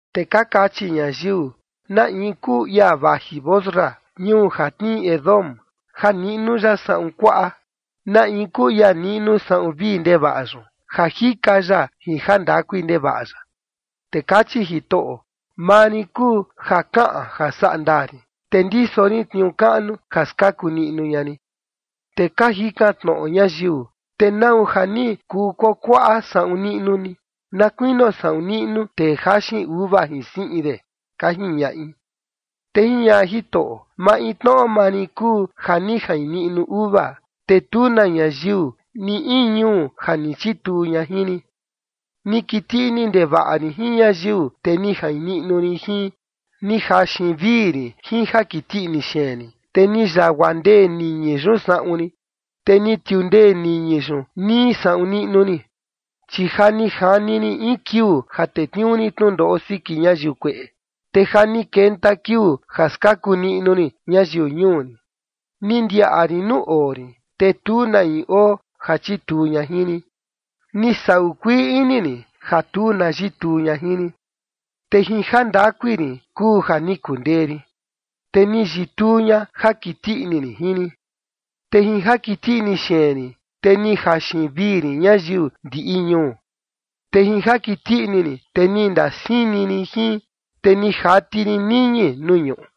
Te ka kachi ñayiu: “¿Na in kuu ia vaji Bosra, ñuu ja tnii Edom, ja niꞌnu ya saꞌun kuaꞌa? ¿Na in kuu ia niꞌnu saꞌun vii ndevaꞌa yun ja jika ya jin jandakui ndevaꞌa ya?” Te kachi Jitoꞌo: “Maa rin kuu ja kaꞌan ja sandaa rin, te ndiso rin tniuu kaꞌnu ja skaku niꞌnu ña rin”. Te ka jikan tnoꞌo ñayiu: “¿Te nau ja ni kuu kuakuaꞌa saꞌun niꞌnu ni na kuinio saꞌun niꞌnu tee jaxin uva jin siꞌin de?”, ka jiñaꞌi. Te jiñaꞌa Jitoꞌo: “Maintnoꞌo maa rin kuu ja ni jain niꞌnu uva, te tu na ñayiu ni in ñuu ja ni chituu ña jin rin. Ni kiti ini ndevaꞌa rin jin ñayiu, te ni jain niꞌnu rin jin. Ni jaxin vii rin jin jakiti ini xeen rin, te ni yagua ndee niñi yun saꞌun rin, te ni tiundee niñi yun nii saꞌun niꞌnu rin. Chi ja ni jani rin in kiuu ja tetniuu rin tnundoꞌo siki ñayiu kueꞌe, te ja ni kenta kiuu ja skaku niꞌnu rin ñayiu ñuu rin. Ni ndiaꞌa rin nuu oo rin, te tu na in oo ja chituu ña jin rin. Ni saꞌu kuii ini rin ja tu na yituu ña jin rin te jin jandakui rin kuu ja ni kundee rin, te ni yituu ña ja kiti ini rin jin rin. Te jin jakiti ini xeen rin, te ni jaxin vii rin ñayiu ndiꞌi ñuu, te jin jakiti ini rin, te ni ndasini rin jin, te ni jati rin niñi nuu ñuꞌu.”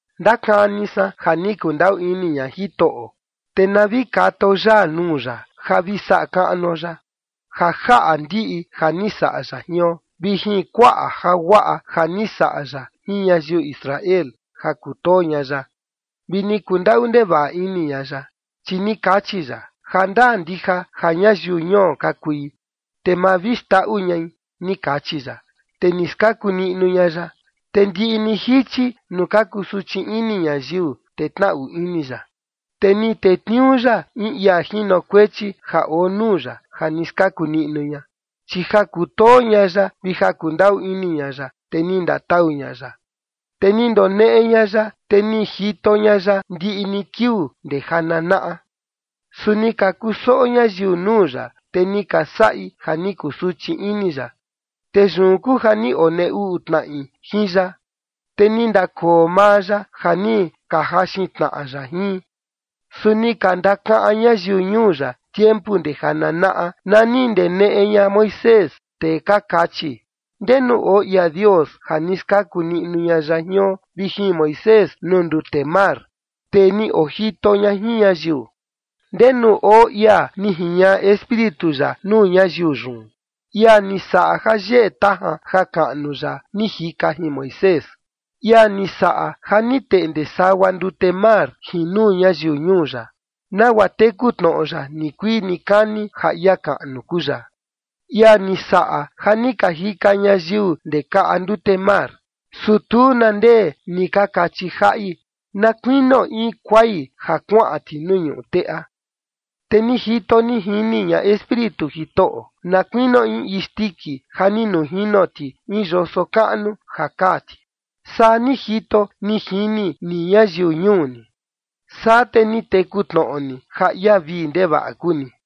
Ndakani san ja ni kundaꞌu ini ña Jitoꞌo, te na vi katao yaa nuu ya ja vi saꞌa kaꞌnuo ya, ja jaꞌa ndiꞌi ja ni saꞌa ya jion vi jin kuaꞌa jaguaꞌa ja ni saꞌa ya jin ñayiu Israel ja kutoo ña ya, vi ni kundaꞌu ndevaꞌa ini ña ya. Chi ni kachi ya: “Jandaa ndija ja ñayiu ñuo ka kui, te ma vi xndaꞌu ñai”, ni kachi ya. Te ni skaku niꞌnu ña ya. Te ndiꞌi ni jichi nuu ka kusuchi ini ñayiu, te tnaꞌu ini ya, te ni tetniuu ya in ia jinokuechi ja oo nuu ya ja ni skaku niꞌnu ña, chi ja kutoo ña ya vi ja kundaꞌu ini ña ya, te ni ndatau ña ya, te ni ndoneꞌe ña ya, te ni jito ña ya ndiꞌi ni kiuu ndee jananaꞌa. Su ni ka kusoꞌo ñayiu nuu ya, te ni ka saꞌi ja ni kusuchi ini ya, te yun kuu ja ni ka onee uꞌu tnaꞌi jin ya te ni ndakoo maa ya ja ni ka jaxin tnaꞌa ya jin. Su ni ka ndakaꞌan ñayiu ñuu ya tiempu ndee janaꞌa, na ni ndeneꞌe ña Moisés, te ka kachi: “¿Ndenu oo ia Dios ja ni skaku niꞌnu ña ya jion vi jin Moisés nuu ndute mar, tee ni ojito ña jin ñayiu? ¿Ndenu oo ia ni jiñaꞌa Espíritu ya nuu ñayiu yun, ia ni saꞌa ja yeꞌe tajan jakaꞌnu ya ni jika jin Moisés, ia ni saꞌa ja ni teꞌnde sagua ndute mar jin nuu ñayiu ñuu ya, nagua teku tnoꞌo ya nikuii nikani ja ia kaꞌnu kuu ya, ia ni saꞌa ja ni ka jika ñayiu ndee kaꞌa ndute mar?” Su tu na ndee ni ka kachiꞌi jaꞌi, na kuinio in kuai ja kuaꞌan ti nuu ñuꞌu teꞌa. Te ni jito ni jini ña Espíritu Jitoꞌo, na kuinio in isndiki ja ni nujino ti in yoso kaꞌnu ja kaa ti. Saa ni jito ni jini ni ñayiu ñuu ni, saa te ni teku tnoꞌo ni ja ia vii ndevaꞌa kuu ni.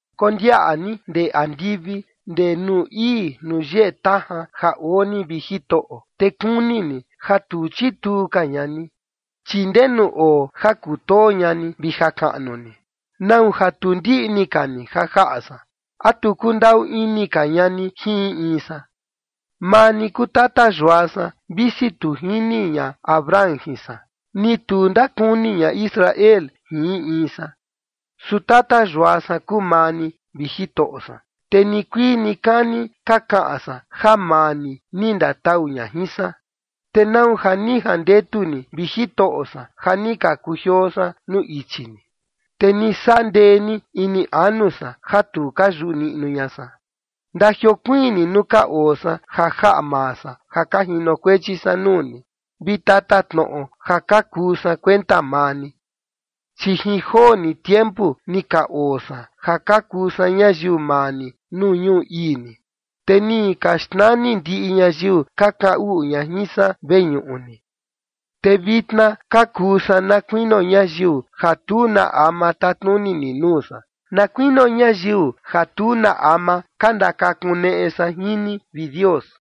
Kondiaꞌa ni ndee andivi, ndee nuu ii nuu yeꞌe tajan ja oo ni, vi Jitoꞌo, te kuni ni ja tu chituu ka ña ni. Chi ¿ndenu oo ja kutoo ña ni vi jakaꞌnu ni? ¿Nau ja tu ndiꞌni ka ni ja jaꞌa san? ¿A tu kundaꞌu ini ka ña ni jin in in san? Maa ni kuu tata yua san, visi tu jini ña Abraham jin san, ni tu ndakuni ña Israel jin in in san. Su tata yua san kuu maa ni, vi Jitoꞌo san, te nikuii nikani ka kaꞌan san ja maa ni ni ndatau ña jin san. ¿Te nau ja ni jandetu ni, vi Jitoꞌo san, ja ni ka kujioo san nuu ichi ni, te ni saꞌa ndee ni ini anu san ja tu ka yuꞌu niꞌnu ña san? Ndajiokuiin ni nuu ka oo san ja jaꞌa maa san ja ka jinokuechi san nuu ni, vi tatatnoꞌo ja ka kuu san kuenta maa ni. Chi jin joo ni tiempu ni ka oo san ja ka kuu san ñayiu maa ni nuu ñuu ii ni, te ni ka xnani ndiꞌi ñayiu ka kaꞌan uꞌu ña jin san veñuꞌu ni. Te vitna ka kuu san na kuinio ñayiu ja tu na ama tatnuni ni nuu san, na kuinio ñayiu ja tu na ama ka ndakakuneꞌe san jin ni, vi Dios.